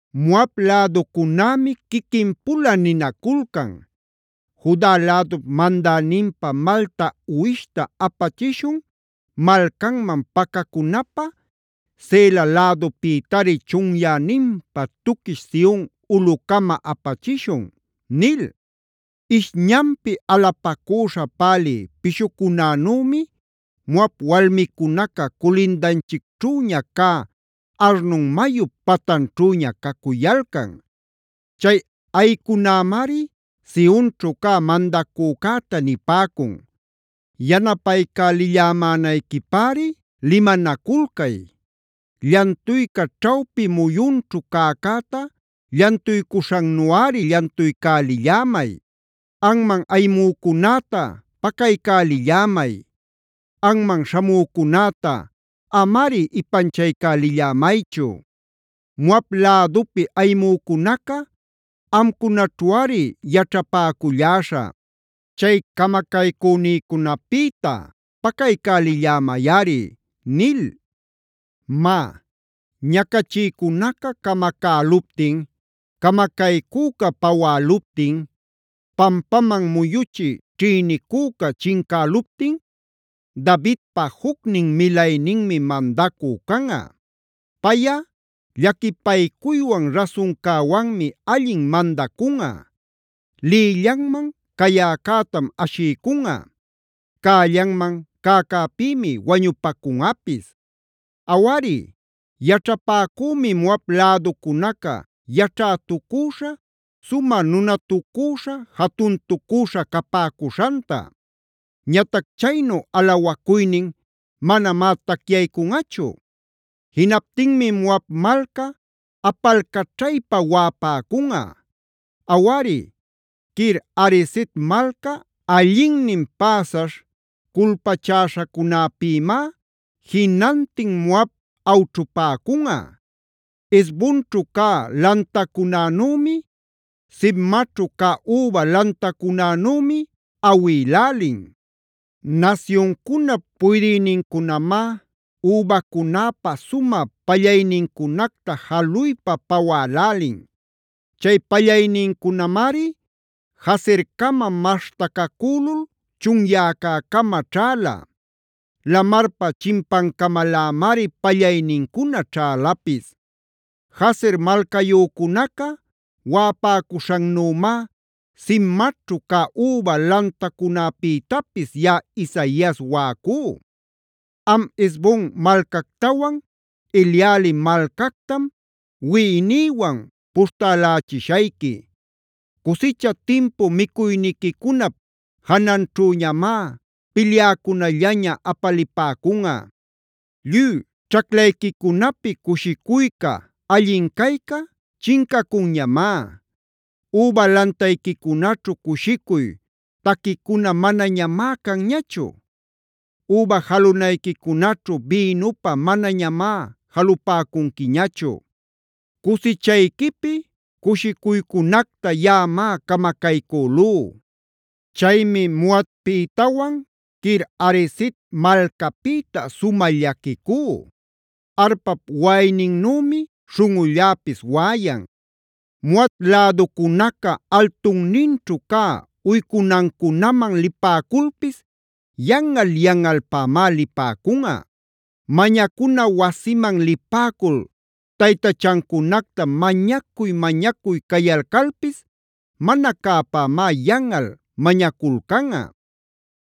Moab läducunämi quiquin-pula ninaculcan: “Juda lädup mandäninpa malta uwishta apachishun malcanman pacacunapä Sela lädupïtari chunyäninpa tuquish Sion ulꞌucama apachishun” nil. Ishñanpi alapacüśha pälï pishucunanümi, Moab walmicunaca culindanchicćhüña cä Arnon mayup patanćhüña cacuyalcan. Chay ayïcunämari Sionćhu cä mandacücäta nipäcun: “Yanapaycälillämänayquipäri limanaculcay; llantuyca ćhawpi muyunćhu cäcäta llantuycuśhannuꞌari llantuycälillämay. Anman ayimücunäta pacaycälillämay; anman śhamücunäta amari ipanchaycälillämaychu. Moab lädupi ayimücunaca amcunaćhuꞌari yaćhapäculläśhä; chay camacaycünïcunapïta pacaycälillämayꞌari” nil. Má, ñacachïcunaca camacäluptin, camacaycüca pawäluptin, pampaman muyuchï ćhïnicüca chincäluptin, Davidpa jucnin milayninmi mandacü canꞌa. Payꞌa llaquipaycuywan rasuncäwanmi allin mandacunꞌa. Lïllanman cayäcätam ashiycunꞌa; cällanman cäcäpïmi wañupacunꞌapis. Awari, yaćhapäcümi Moab läducunaca yaćhätucüśha, sumä nunatucüśha, jatuntucüśha capäcuśhanta. Ñatac chaynu alawacuynin manamá tacyaycunꞌachu. Jinaptinmi Moab malca apalcaćhaypa waꞌapäcunꞌa; Awari, Kir-hareset malca allinnin päsaśh culpachäśhacunäpïmá jinantin Moab awćhupäcunꞌa. Hesbonćhu cä lantacunänümi, Sibmaćhu cä üba lantacunänümi awïlälin. Nasyuncunap puydïnincunamá übacunäpa sumä pallaynincunacta jaluypa pawälälin. Chay pallaynincunamari Jazercama maśhtacacülul chunyäcäcama ćhäla; lamarpa chimpancamalämari pallaynincuna ćhälapis. Jazer malcayücunaca waꞌapäcuśhannümá Sibmaćhu cä üba lantacunäpïtapis yaꞌa Isaias waꞌacú. Am Hesbon malcactawan, Eleale malcactam wiꞌinïwan puśhtälälichishayqui. Cusicha timpu micuyniquicunap jananćhüñamá pilyäcunallaña apalipäcunꞌa. Lluy ćhaclayquicunapi cushicuyca, allin cayca chincacunñamá. Üba lantayquicunaćhu cushicuy taquicuna manañamá canñachu; üba jalunayquicunaćhu bïnupä manañamá jalupacunquiñachu. Cusichayquipi cushicuycunacta yaꞌamá camacaycülú. Chaymi Moabpïtawan Kir-hareset malcapïta sumä llaquicú. Arpap waꞌayninnümi śhunꞌulläpis waꞌayan. Moab läducunaca altunninćhu cä uycunancunaman lipäculpis yanꞌal-yanꞌalpämá lipäcunꞌa. Mañacuna wasiman lipäcul taytachancunacta mañacuy-mañacuy cayalcalpis mana cäpämá yanꞌal mañaculcanꞌa.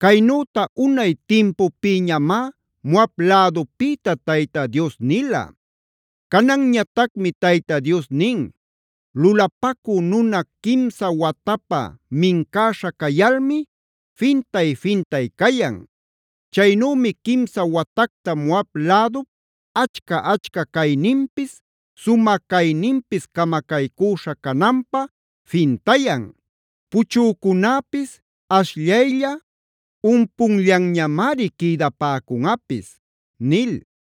Caynüta unay timpupïñamá Moab lädupïta Tayta Dios nila. Cananñatacmi Tayta Dios nin: “Lulapacü nuna quimsa watapä mincäśha cayalmi fintay-fintay cayan. Chaynümi quimsa watacta Moab lädup achca-achca cayninpis, sumä cayninpis camacaycüśha cananpä fintayan. Puchücunäpis ashllaylla, umpunllanñamari quïdapäcunꞌapis” nil.